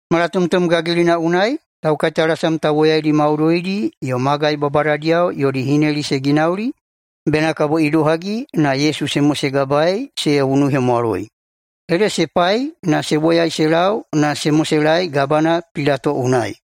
Malatomtom gagilina unai taukaitalasam tauwoyaidi maudoidi yo magai babadadiyao yodi hineli se ginauli bena kabo idohagi na Yesu se mosegabaei se unuhemwaloi. Ede se pai na se woyai se lau na se moselaei Gabana Pilato unai.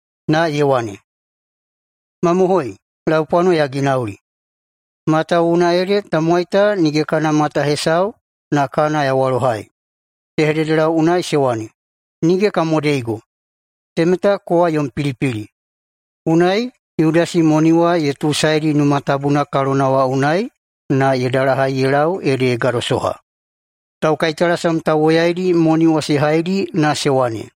Na ye wane, “Mamohoi, laupwano ya ginauli, matawuwuna ede tamowai ta nige kana mata hesau na kana ya walohai.” Se hededelau unai se wane, “Nige ka modeigo, temeta kowa yom pilipili.” Unai Yudasi moni wa ye tuusaedi Numa Tabuna kalona wa unai na ye dalahai ye lau ede ye gadosoha. Taukaitalasam tauwoyaidi moni wa se haidi na se wane,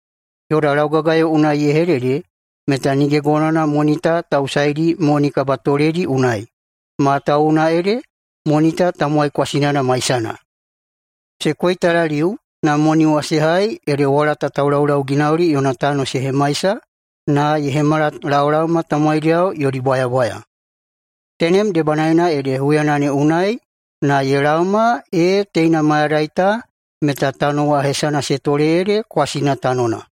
“Yoda laugagayo unai ye hedede meta nige gonowana moni ta ta usaidi moni kabatoledi unai, matawuwuna ede moni ta tamowai kwasinana maisana.” Se koitalaliu na moni wa se hai ede walata taulaulauginauli yona tano se hemaisa na ye hemala laolaoma tamowaidiyao yodi bwayabwaya. Tenem debanaena ede huyana ne unai na ye laoma ee teina mayadai ta meta tano wa hesana se tole ede Kwasina Tanona.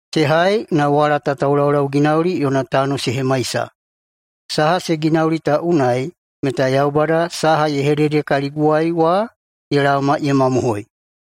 se hai na walata taulaulauginauli yona tano se hemaisa. Saha se ginauli ta unai meta Yaubada saha ye hedede kaliguwai wa ye laoma ye mamohoi.”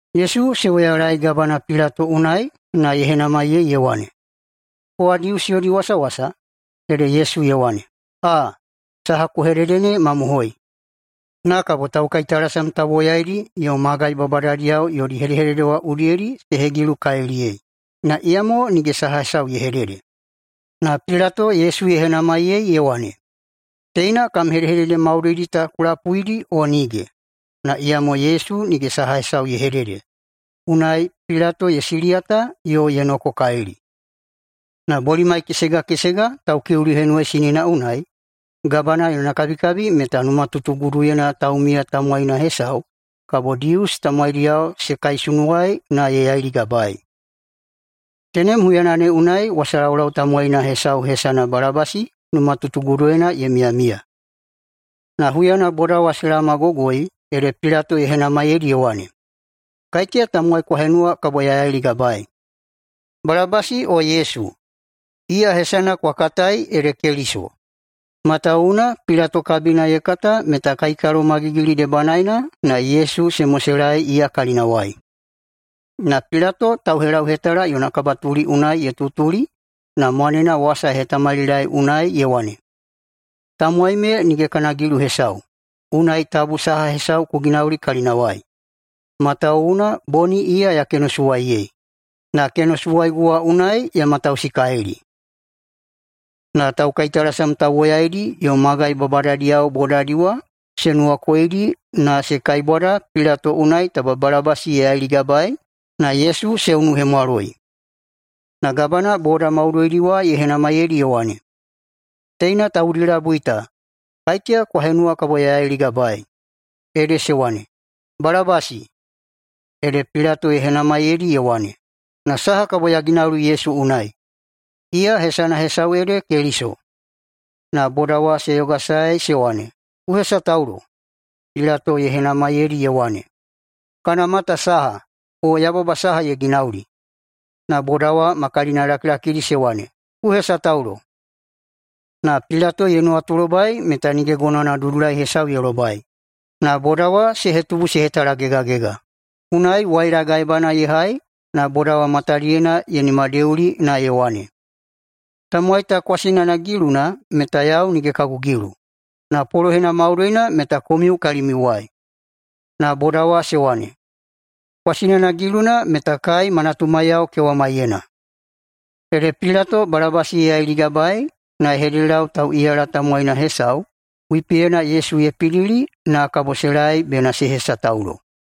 Yesu se woyalaei Gabana Pilato unai na ye henamaiyei ye wane, “Kowa Dius yodi wasawasa?” Ede Yesu ye wane, “Aa, saha ku hedede ne mamohoi.” Na kabo taukaitalasam tauwoyaidi yo magai babadadiyao yodi hedehedede udiyedi se hegilukaliliyei, na iyamo nige saha hesau ye hedede. Na Pilato Yesu ye henamaiyei ye wane, “Teina kam hedehedede maudoidi ta ku lapuidi, o nige?” Na iyamo Yesu nige saha hesau ye hedede, unai Pilato ye siliyata yo ye nokokalili. Na bolimai kesega kesega, Taukiuli Henuwaisinina unai, gabana yona kabikabi meta numatutuguduyena taumiya tamowaina hesau kabo Dius tamowaidiyao se kaisunuwai na ye yailigabaei. Tenem huyana ne unai wasalaulau tamowaina hesau hesana Balabasi numatutuguduyena ye miyamiya. Na huyana boda wa se laomagogoi ede Pilato ye henamaiyeidi ye wane, “Kaiteya tamowai kwa henuwa kabo ya yailigabaei, Balabasi o Yesu, iya hesana kwa katai ede Keliso?” Matawuwuna Pilato kabina ye kata meta kaikalomagigili debanaena na Yesu se moselaei iya kalinawai. Na Pilato tauhelauhetala yona kabatuli unai ye tutuli na mwanena wasa ye hetamalilaei unai ye wane, “Tamowai me nige kana gilu hesau, unai tabu saha hesau ku ginauli kalinawai. Matawuwuna boni iya ya kenosuwaiyei, na kenosuwaigu wa unai ya matausikalili.” Na taukaitalasam tauwoyaidi yo magai babadadiyao bodadi wa se nuwakoidi na se kaibwada Pilato unai taba Balabasi ye yailigabaei na Yesu se unuhemwaloi. Na Gabana boda maudoidi wa ye henamaiyeidi ye wane, “Teina taudi labui ta, kaiteya kwa henuwa kabo ya yailigabaei?” Ede se wane, “Balabasi.” Ede Pilato ye henamaiyeidi ye wane, “Na saha kabo ya ginauli Yesu unai, iya hesana hesau ede Keliso?” Na boda wa se yogasae se wane, “Ku hesataulo.” Pilato ye henamaiyeidi ye wane, “Kana mata saha, o yababa saha ye ginauli?” Na boda wa ma kalinalakilakidi se wane, “Ku hesataulo.” Na Pilato ye nuwatulobai meta nige gonowana dudulai hesau ye lobai, na boda wa se hetubu se hetalagegagega. Unai waila gaebana ye hai na boda wa matadiyena ye nimadeuli na ye wane, “Tamowai ta kwasinana giluna meta yau nige kagu gilu. Na polohena maudoina meta komiu kalimiuwai.” Na boda wa se wane, “Kwasinana giluna meta kai ma natumaiyao kewamaiyena.” Ede Pilato Balabasi ye yailigabaei na ye hededelau tauꞌiyala tamowaina hesau wipiyena Yesu ye pidili na kabo se laei bena se hesataulo.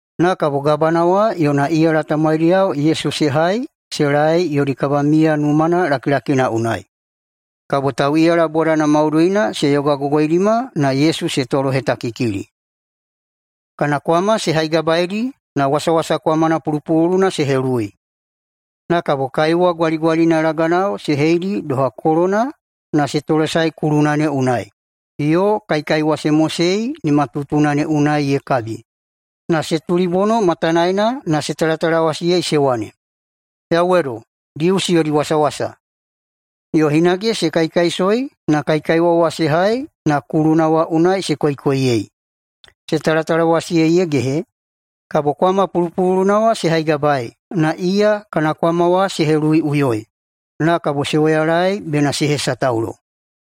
Na kabo gabana wa yona iyala tamowaidiyao Yesu se hai se laei yodi kabamiya numana lakilakina unai. Kabo tauꞌiyala bodana maudoina se yogagogoidima na Yesu se tolohetakikili. Kana kwama se haigabaeidi na wasawasa kwamana pulupululuna se heluwui. Na kabo kaiwa gwaligwalina laganao se heidi doha kolona na se tolesaei kuluna ne unai, yo kaikaiwa se mosei nimatutuna ne unai ye kabi, na se tulibono matanaena na se talatalawasiyei se wane, “Yauwedo, Dius yodi wasawasa!” Yo hinage se kaikaisoi na kaikaiwa wa se hai na kuluna wa unai se koikoiyei. Se talatalawasiyei ye gehe, kabo kwama pulupululuna wa se haigabaei na iya kana kwama wa se heluwuiꞌuyoi. Na kabo se woyalaei bena se hesataulo.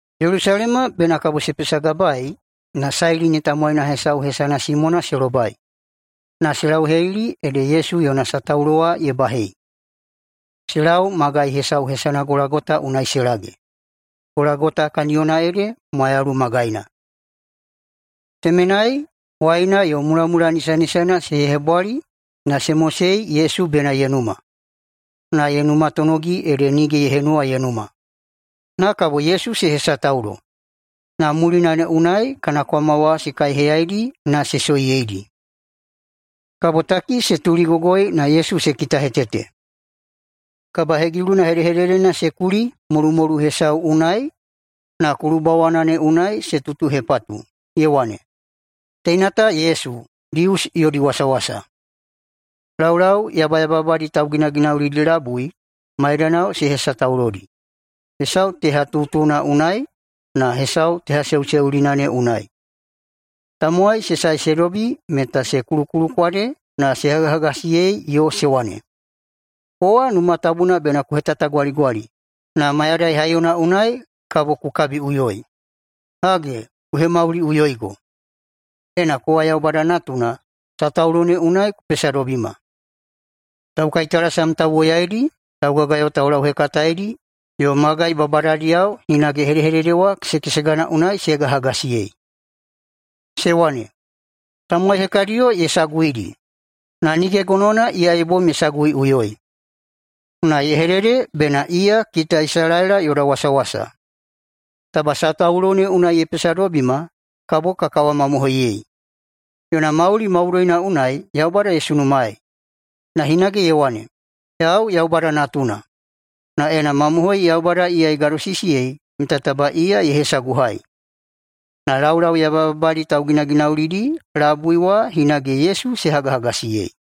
Yelusalema bena kabo se pesagabaei na Sailini tamowaina hesau hesana Simona se lobai, na se lauhelili ede Yesu yona sataulo wa ye bahei. Se lau magai hesau hesana Golagota unai se lage. Golagota kaniyona ede mwayalu magaina. Temenai waina yo mulamula nisanisana se hebwali na se mosei Yesu bena ye numa. Na ye numatonogi ede nige ye henuwa ye numa. Na kabo Yesu se hesataulo, na mulina ne unai kana kwama wa se kaiheyaidi na se soiyeidi. Kabotaki se tuligogoi na Yesu se kitahetete. Kabahegiluna hedehededena se kuli [molumolu hesau unai] na kulubawana ne unai se tutuhepatu, ye wane, “TEINA TA YESU, DIUS YODI WASAWASA.” Laulau yabayababadi tauginaginaulidi labui maidanao se hesataulodi, hesau tehatutuna unai na hesau tehaseuseulina ne unai. Tamowai se sae se dobi meta se kulukulukwade na se hagahagasiyei yo se wane, “Kowa Numa Tabuna bena ku hetatagwaligwali na mayadai haiyona unai kabo ku kabiꞌuyoi, hage, ku hemauliꞌuyoigo. Ena kowa Yaubada Natuna, sataulo ne unai ku pesadobima!” Taukaitalasam tauwoyaidi, laugagayo taulauhekataedi, yo magai babadadiyao hinage hedehedede wa kesekesegana unai se hagahagasiyei. Se wane, “Tamowai hekadiyo ye saguidi na nige gonowana iya ye bom ye saguiꞌuyoi. Na ye hedede bena iya kita Isalaela yoda wasawasa! Taba sataulo ne unai ye pesadobima kabo ka kawamamohoiyei. Yona mauli maudoina unai Yaubada ye sunumaei, na hinage ye wane, ‘Yau Yaubada Natuna.’ Na ena mamohoi Yaubada iya ye gadosisiyei meta taba ye hesaguhai!” Na laulau yabayababadi tauginaginaulidi labui wa hinage Yesu se hagahagasiyei.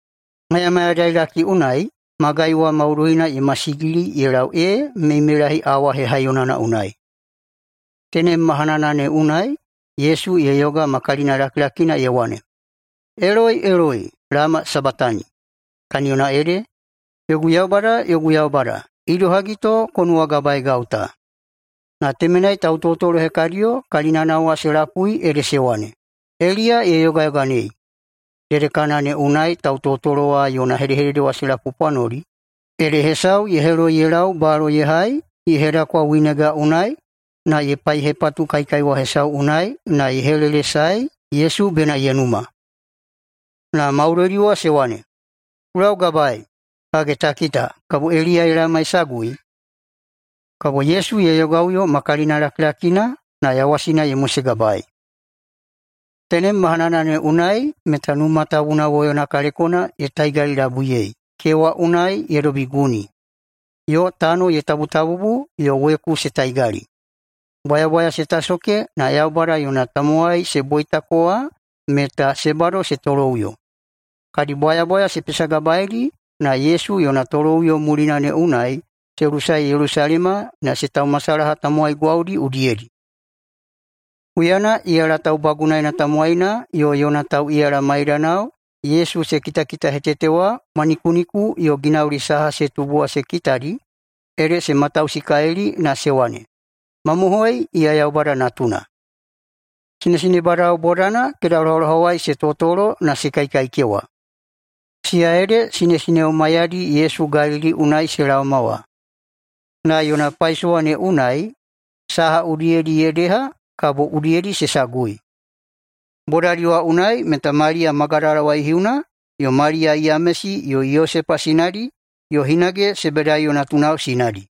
Mayamayadailaki unai magai wa maudoina ye masigili ye lau ee meimeilahi awa hehaiyonana unai. Tenem mahanana ne unai Yesu ye yoga ma kalinalakilakina ye wane, “Eloi, eloi, lama sabatani?” Kaniyona ede, “Yogu Yaubada, yogu Yaubada, idohagi to ku nuwagabaeigau ta?” Na temenai tautotolo hekadiyo kalinana wa se lapui ede se wane, “Eliya ye yogayoganei.” Dedekana ne unai tautotolo wa yona hedehedede ta se lapupwanoli, ede hesau ye heloi ye lau balo ye hai, ye hedakwa winega unai na ye paihepatu kaikaiwa hesau unai na ye helelesaei Yesu bena ye numa. Na maudoidi wa se wane, “Ku laugabaei! Hage ta kita, kabo Eliya ye laoma ye sagui?” Kabo Yesu ye yogaꞌuyo ma kalinalakilakina, na yawasina ye mosegabaei. Tenem mahanana ne unai meta Numa Tabuna woyona kalekona ye taigalilabuiyei kewa unai ye dobi guni, yo tano ye tabutabubu yo weku se taigali. Bwayabwaya se tasoke na Yaubada yona tamowai se boitako wa meta se bado se toloꞌuyo. Kadi bwayabwaya se pesagabaeidi na Yesu yona toloꞌuyo mulina ne unai se lusae Yelusalema na se taumasalaha tamowai gwaudi udiyedi. Huyana iyala taubagunaena tamowaina yo yona tauꞌiyala maidanao Yesu se kitakitahetete wa mwanikuniku yo ginauli saha se tubu wa se kitadi ede se matausikalili na se wane, “Mamohoi, iya Yaubada Natuna!” Sinesinebadao bodana kedalohalohawai se totolo na se kaikaikewa. Siya ede sinesineo maiyadi Yesu Galili unai se laoma wa, na yona paisowa ne unai saha udiyedi ye deha, kabo udiyedi se sagui. Bodadi wa unai meta Maliya Magadala waihiuna, yo Maliya Yamesi yo Yosepa sinadi, yo hinage Sebedaiyo natunao sinadi.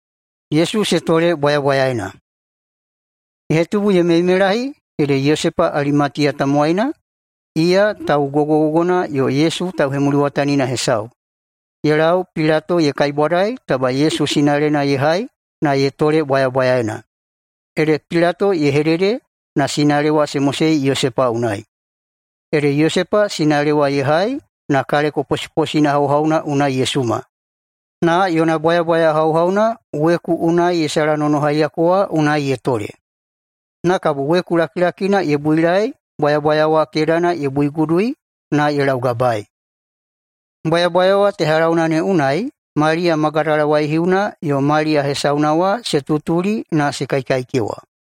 Ye hetubu ye meimeilahi ede Yosepa Alimatiya tamowaina, iya tau gogogogona yo Yesu tauhemuliwatanina hesau, ye lau Pilato ye kaibwadai taba Yesu sinalena ye hai na ye tole bwayabwayaena. Ede Pilato ye hedede na sinale wa se mosei Yosepa unai. Ede Yosepa sinale wa ye hai na kaleko posiposina hauhauna unai ye suma, na yona bwayabwaya hauhauna weku unai ye salanonohaiyako wa unai ye tole. Na kabo weku lakilakina ye builaei bwayabwaya wa kedana ye buigudui na ye laugabai. Bwayabwaya wa tehalauna ne unai Maliya Magadala waihiuna yo Maliya hesauna wa se tutuli na se kaikaikewa.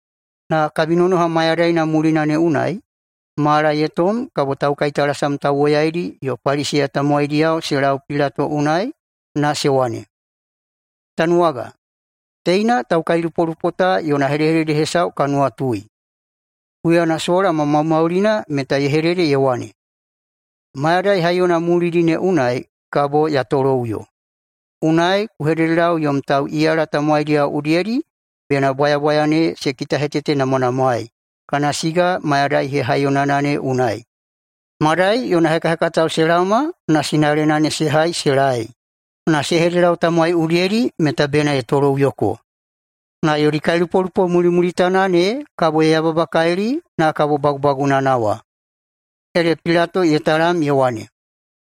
Na kabinonoha mayadaina mulina ne unai mala ye tom kabo taukaitalasam tauwoyaidi yo Paliseya tamowaidiyao se lau Pilato unai na se wane, “Tanuwaga, teina taukailupolupo ta yona hedehedede hesau ka nuwatui. Huyana sola ma maumaulina meta ye hedede ye wane, ‘Mayadai haiyona mulidi ne unai kabo ya toloꞌuyo.’ Unai ku hededelau yom tauꞌiyala tamowaidiyao udiyedi bena bwayabwaya ne se kitahetetenamwanamwaei kana siga mayadai hehaiyonana ne unai, madai yona hekahekatao se laoma na sinalena ne se hai se laei na se hededelau tamowai udiyedi meta bena ye toloꞌuyoko. Na yodi kailupolupo mulimulitana ne kabo ye yababakalili na kabo bagubagunana wa.” Ede Pilato ye talam ye wane,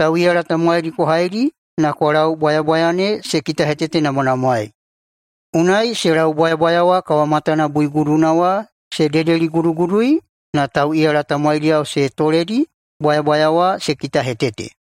“Tauꞌiyala tamowaidi kwa haidi na kwa lau bwayabwaya ne se kitahetetenamwanamwaei.” Unai se lau bwayabwaya wa kawamatana buiguduna wa se dedeligudugudui na tauꞌiyala tamowaidiyao se toledi bwayabwaya wa se kitahetete.